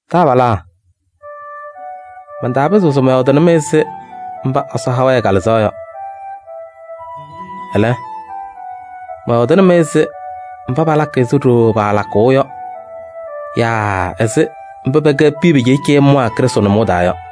Taabalaa, mantaapɩzɩɣ se mɔyɔɔdɩnɩ-mɩ ɛzɩ mba Ɛsɔ ha-wɛ ɛ-Kalɩzaɣ yɔ. Ɛlɛ, mɔyɔɔdɩnɩ-mɩ ɛzɩ mba palakɩ ɛzɩ ɖooo paalakʋʋ yɔ yaa ɛzɩ mba pɛkɛ piya pɩcɩɩcɩyɩmwaa Krɩstʋ nʋmɔʋ taa yɔ.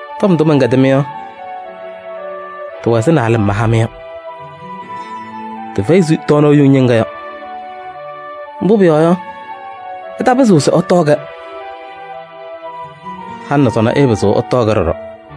Tɔm ndʋ mɛnkɛdɩ-mɩ yɔ, tɩwɛ ɛzɩ naalɩm maha-mɩ yɔ, tɩfɛyɩ ɛzɩ tɔɔnaɣ yuŋ ñɩŋga yɔ. Mbʋ pʋyɔɔ yɔ, ɩtaapɩzɩɣ se ɩtɔɔ-kɛ. Halɩ nɛ sɔnɔ ɩɩpɩzɩɣ ɩtɔɔ-kɛ ɖɔɖɔ.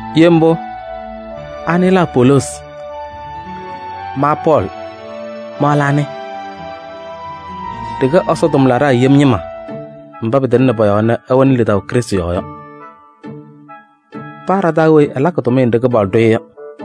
Ye mbʋ, anɩ lɛ Apoloosi? Ma Pɔɔlɩ, ma lɛ anɩ? Ɖɩkɛ Ɛsɔ tʋmlaɖaa yem ñɩma mba pɩtɩŋnɩ pɔ-yɔɔ nɛ ɩwɛnɩ lidaʋ Krɩstʋ yɔɔ yɔ. Paa ɖa-taa weyi ɛlakɩ tʋmɩyɛ nɖɩ Kɩpaɣlʋ ɖʋ-ɩ yɔ.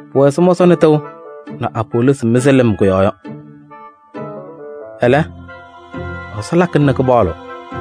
Pʋwɛ ɛzɩ mɔsɔnɩ tɩʋ nɛ Apoloosi mɩzɩ kʋ-yɔɔ lɩm yɔ. Ɛlɛ, Ɛsɔ lakɩna nɛ kɩpaɣlɩɣ.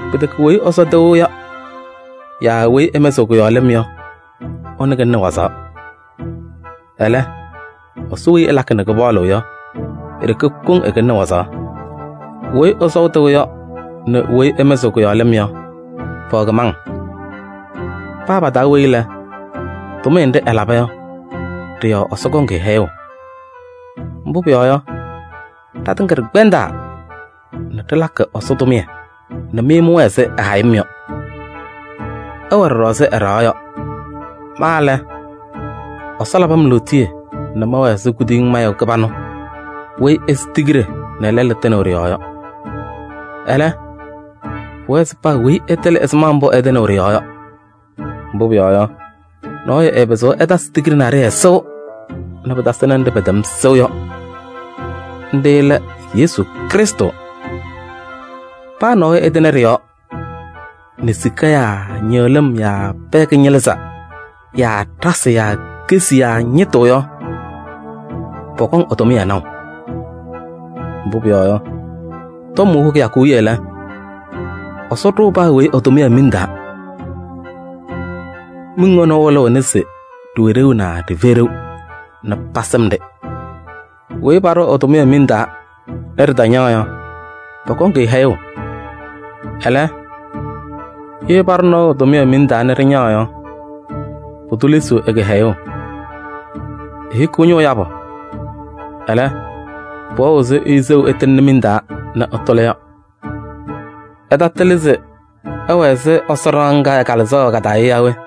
Pɩtɛkɛ weyi ɛsɔʋ tɩʋ yaa weyi ɛmɩzɩɣ kʋ-yɔɔ lɩm yɔ, ɛkɩlɩnɩ wazaɣ. Ɛlɛ, Ɛsɔ weyi ɛlakɩ nɛ kɩpaɣlɩɣ yɔ, e-ɖeke koŋ ɛkɩlɩnɩ wazaɣ. Weyi ɛsɔʋ tɩʋ yɔ nɛ weyi ɛmɩzɩɣ kʋ-yɔɔ lɩm yɔ, pɛwɛ kɩmaŋ. Paa pa-taa weyi lɛ, tʋmɩyɛ nɖɩ ɛlaba yɔ, ɖɩ-yɔɔ Ɛsɔ kɔŋ-ɩ hɛyʋʋ. Mbʋ pʋyɔɔ yɔ, ɖatɩŋa ɖɩkpɛndaa nɛ ɖɩlakɩ Ɛsɔ tʋmɩyɛ nɛ mɩ mɩwɛɛ ɛzɩ ɛ-hayɩm yɔ. Ɩwɛ ɖɔɖɔ ɛzɩ ɛ-ɖɩɣa yɔ. Ma lɛ, Ɛsɔ labɩ-m lootiye nɛ mɛwɛɛ ɛzɩ kuduyiŋ mayʋ kɩbanʋ weyi ɛsɩ tigiɖe nɛ lɛlʋ tɩnɩɣ ɖɩ-yɔɔ yɔ. Ɛlɛ, pʋwɛɛ se paa weyi ɛtɩlɩ ɛzɩma mbʋ ɛtɩnɩɣ ɖɩ-yɔɔ yɔ. Mbʋ pʋyɔɔ yɔ, nɔɔyʋ ɛɛpɩzɩɣ ɛtasɩ tigiɖe naɖɩyɛ sɩʋ nɛ pɩtasɩnɩ nɖɩ pɛtɛm sɩʋ yɔ. Nɖɩ lɛ Yesu Krɩstʋ. Paa nɔɔyʋ ɛtɩnɩ ɖɩ-yɔɔ nɛ sika yaa ñɩɣlɩm yaa pɛɛ kɩñɩlɩzɛɛ yaa ɖasɩ yaa kesi yaa ñɩtʋ yɔ, pɔkɔŋ ɛ-tʋmɩyɛ naʋ. Mbʋ pʋyɔɔ yɔ, tɔm hʋʋ kɩyakʋ wiye lɛ, Ɛsɔ ɖʋʋ paa weyi ɛ-tʋmɩyɛ miŋ taa. Miŋ ɛnʋ ɛwɩlɩɣna se ɖɩwɛ ɖeu naa ɖɩfɛyɩ ɖeu nɛ pasɩm-ɖɩ. Weyi paɖʋʋ ɛ-tʋmɩyɛ miŋ taa nɛ ɖɩtañaɣ yɔ, pɔkɔŋ-ɩ hɛyʋʋ. Ɛlɛ, ye paɖʋ nɔɔyʋ tʋmɩyɛ miŋ taa nɛ ɖɩñaɣ yɔ, pʋdʋ lesiɣ ɛ-kɩhɛyʋʋ. Ehikiɣ ñʋʋ yabʋ, ɛlɛ, pʋwɛɣ ɛzɩ ɛyʋ seɣu ɛtɩŋɩɣnɩ miŋ taa nɛ ɛtʋlɩ yɔ. Ɩtatɩlɩ se ɩwɛ ɛzɩ Ɛsɔ ɖɩɣa ŋga ɛ-Kalɩzaɣ wɛ ka-taa yɔ yaa we?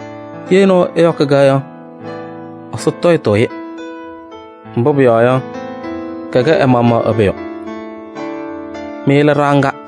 Ye nɔɔyʋ ɛyɔkɩ-kɛ yɔ, Ɛsɔ tɔyɩtʋʋ-ɩ. Mbʋ pʋyɔɔ yɔ, kɛkɛ ɛ-maɣmaɣ ɛ-pʋyʋ. Mɩ lɛ ɖɩɣa ŋga.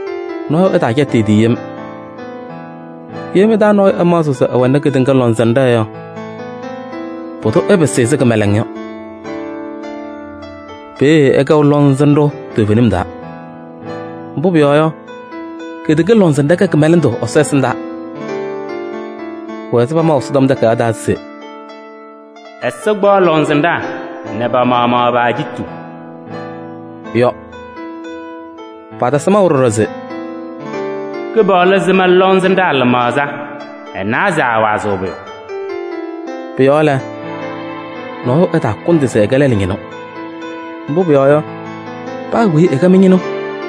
Nɔɔyʋ ɛtaacɛtɩ ɛ-tɩ yem. Ye mɩ-taa nɔɔyʋ ɛmaɣzɩɣ se ɛwɛnɩ kedeŋa lɔŋsɩnɖɛ yɔ, pʋdʋ ɛpɩsɩ ɛzɩ kɩmɛlɛŋ yɔ. Peeye ɛkɛɣ lɔŋsɩnɖʋ toovenim taa. Mbʋ pʋyɔɔ yɔ, kedeŋa lɔŋsɩnɖɛ kɛ kɩmɛlɛndʋ Ɛsɔ ɛsɩndaa. Pʋwɛ ɛzɩ pamaʋ Ɛsɔtɔm Takayaɣ taa se: “Ɛsɔ kpaɣ lɔŋsɩnɖaa nɛ pa-maɣmaɣ pa-ajiitu” yɔ. Patasɩ maʋ ɖɔɖɔ se: “Kɩpaɣlʋ sɩm lɔŋsɩnɖaa lɩmaɣza. Ɛnawa se aawazɩɣ pʋyʋ.” Pʋ-yɔɔ lɛ, nɔɔyʋ ɛtaakʋndɩ se ɛkɛ lɛlʋ ñɩnʋ. Mbʋ pʋyɔɔ yɔ, paa weyi ɛkɛ mɩ-ñɩnʋ: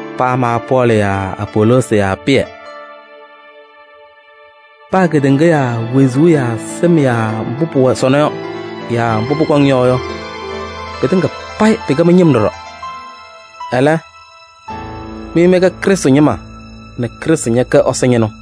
paa ma Pɔɔlɩ yaa Apoloosi yaa Pɩyɛ. Paa kedeŋa yaa wezuu yaa sɩm yaa mbʋ pʋwɛ sɔnɔ yaa mbʋ pʋkɔŋ yɔ yɔ, pɩtɩŋa payɩ pɩkɛ mɩ-ñɩm ɖɔɖɔ. Ɛlɛ, mɩ mɩkɛ Krɩstʋ ñɩma nɛ Krɩstʋ ñɛkɛ Ɛsɔ ñɩnʋ.